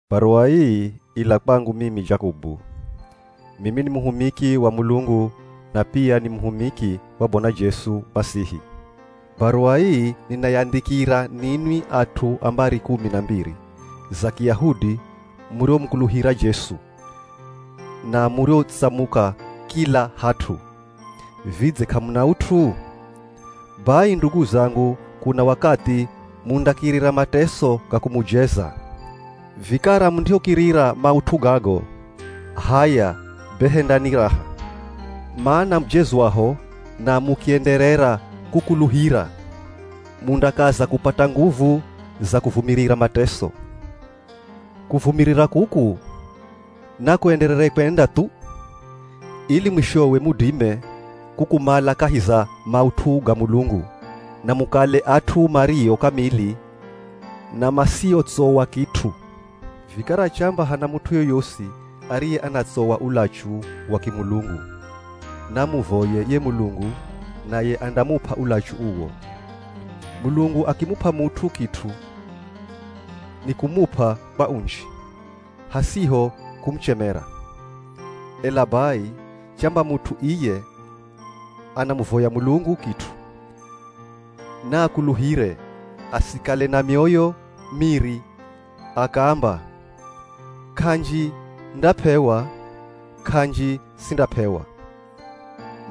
Baruwa ii ila kwangu mimi Jakobu. Mimi ni muhumiki wa Mulungu na pia ni muhumiki wa Bwana Jesu Masihi. Baruwa ii ninayandhikira ninwi at'u a mbari kumi na mbiri za Kiyahudi muriomukuluhira Jesu, na muriotsamuka kila hat'u. Vidze k'amuna ut'u? Bai ndugu zangu kuna wakathi mundakirira mateso ga kumujeza. Vikara mundihokirira maut'u gago, h'aya be hendani raha. Mana mujezwaho na mukienderera kukuluhira, mundakaza kupata nguvu za kuvumirira mateso. Kuvumirira kuku nakuenderere kwenda thu, ili mwishowe mudime kukumala kahi za maut'u ga Mulungu, na mukale at'u mario kamili na masiotsowa kit'u. Vikara chamba hana mut'u yoyosi ariye anatsowa ulachu wa kimulungu, naamuvoye ye Mulungu naye andamup'a ulachu uwo. Mulungu akimup'a mut'u kit'u, nikumup'a kwa unji, hasiho kumuchemera. Ela bai, chamba mut'u iye anamuvoya Mulungu kit'u, naakuluhire, asikale na mioyo miri akaamba, “K'anji ndap'ewa, k'anji sindap'ewa.”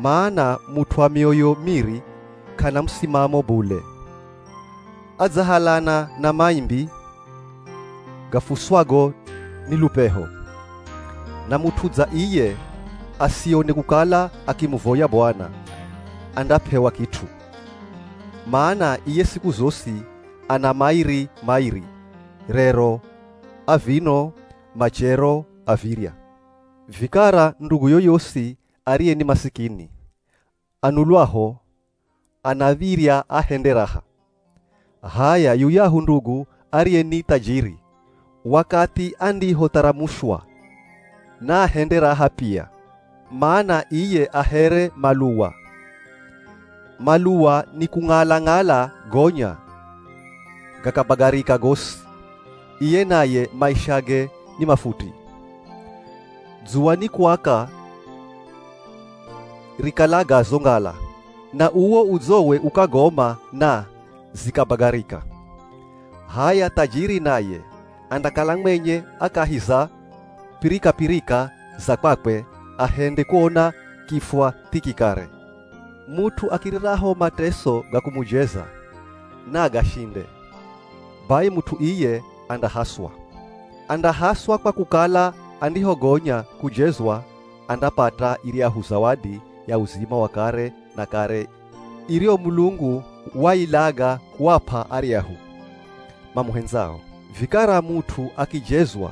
Mana mut'u wa mioyo miri k'ana musimamo bule, adzahalana na maimbi gafuswago ni lupeho. Na mut'u dza iye asione kukala akimuvoya Bwana, andap'ewa kit'u. Mana iye siku zosi ana mairi-mairi, rero a vino machero a virya. Vikara ndugu yoyosi ariye ni masikini, anulwaho anav̱irya ahende raha. H'aya, yuyahu ndugu ariye ni thajiri, wakathi andihotharamushwa, naahende raha pia, mana iye a here maluwa. Maluwa nikung'ala-ng'ala gonya gakabagarika gosi, iye naye maishage ni mafuti. Dzuwa ni kuaka rikalaga zo ngala, na uwo udzowe ukagoma na zikabagarika. H'aya thajiri naye andakala mwenye a kahi za pirikapirika za kwakwe ahende kuona kifwa thiki kare. Mut'u akiriraho mateso ga kumujeza, na agashinde, bai mut'u iye andahaswa. Andahaswa kwa kukala andihogonya kujezwa andapata iryahu zawadi ya uzima wa kare na kare, iriyo Mulungu wailaga kuap'a aryahu mamuhendzao. Vikara mut'u akijezwa,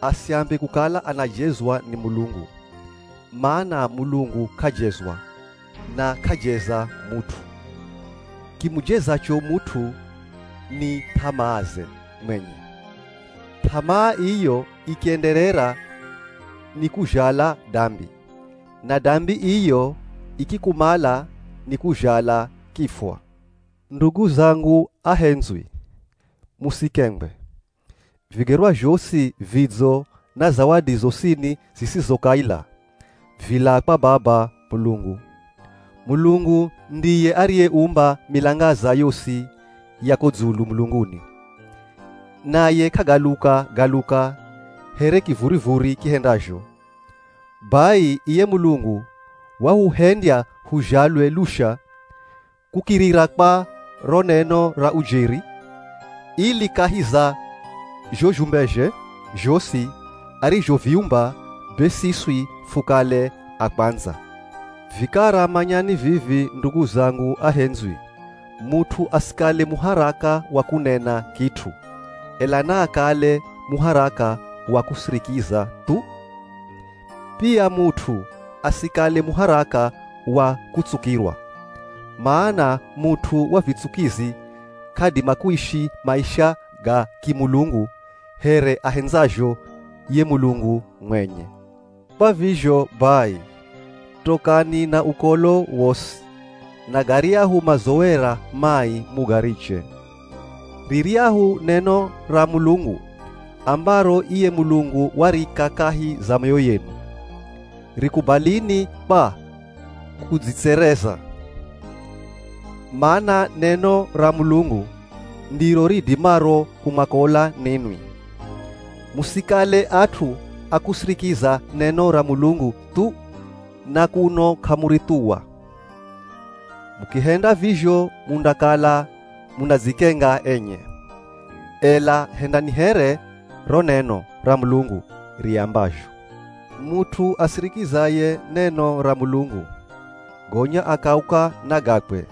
asiambe kukala anajezwa ni Mulungu, mana Mulungu k'ajezwa, na k'ajeza mut'u. Kimujezacho mut'u ni th'amaaze mwenye. Th'amaa iyo ikienderera nikuzhala dambi. Na dambi iyo ikikumala nikuzhala kifwa. Ndugu zangu ahendzwi, musikengwe! Vigerwa zhosi vidzo na zawadi zosini zisizo kaila, vilaa kwa Baba Mulungu. Mulungu ndiye ariyeumba milangaza yosi ya ko dzulu mulunguni, naye k'agaluka-galuka here kivurivuri kihendazho. Bai iye Mulungu wahuhendya huzhalwe lusha kukirira kwa ro neno ra ujeri ili kahi za zho zhumbezhe zhosi arizhoviumba, be siswi fukale a kwandza. Vikara manyani vivi ndugu zangu ahendzwi! Mut'u asikale muharaka wa kunena kit'u, ela naakale muharaka wa kusirikiza thu. Pia mut'u asikale muharaka wa kutsukirwa. Mana mut'u wa vitsukizi k'adima kuishi maisha ga kimulungu here ahendzazho ye Mulungu mwenye. Kwa vizho bai, tokani na ukolo wosi, na garyahu mazowera mai mugariche. Riryahu neno ra Mulungu ambaro iye Mulungu warika kahi za mioyo yenu, rikubalini kwa kudzitsereza. Mana neno ra Mulungu ndiro ridimaro kumwakola ninwi. Musikale at'u a kusirikiza neno ra Mulungu thu na kuno k'amurithuwa. Mukihenda vizho mundakala munadzikenga enye. Ela hendani here ro neno ra Mulungu riambazho. Mut'u asirikizaye neno ra Mulungu, gonya akauka na gakwe,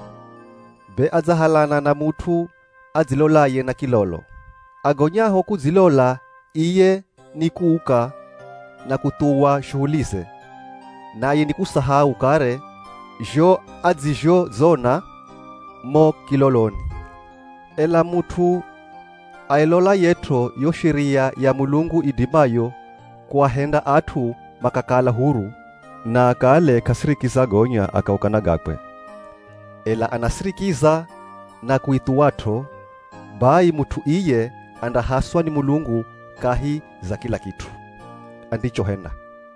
be adzahalana na mut'u adzilolaye na kilolo. Agonyaho kudzilola iye ni kuuka na kuthuwa shuhulize, naye nikusahau kare zho adzizhodzona mo kiloloni. Ela mut'u ailolayet'o yo sheria ya Mulungu idimayo kuahenda at'u makakala huru, na akale k'asirikiza gonya akauka na gakwe, ela anasirikiza na kuithuwat'o, bai mut'u iye andahaswa ni Mulungu kahi za kila kit'u andichohenda.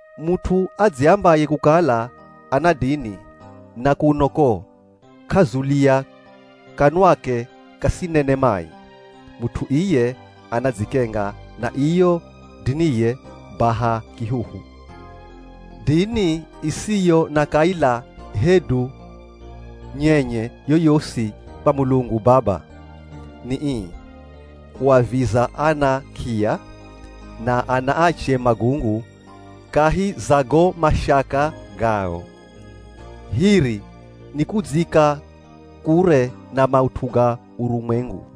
Mut'u adziambaye kukala ana dini na kuno ko k'azulia kanwake kasinene mai, mut'u iye anadzikenga na iyo diniye baha kihuhu. Dini isiyo na kaila hedu nyenye yoyosi kwa Mulungu Baba, ni ii: Kuaviza ana k'iya na anaache magungu kahi za go mashaka gao. Hiri, ni kudziika kure na maut'u ga urumwengu.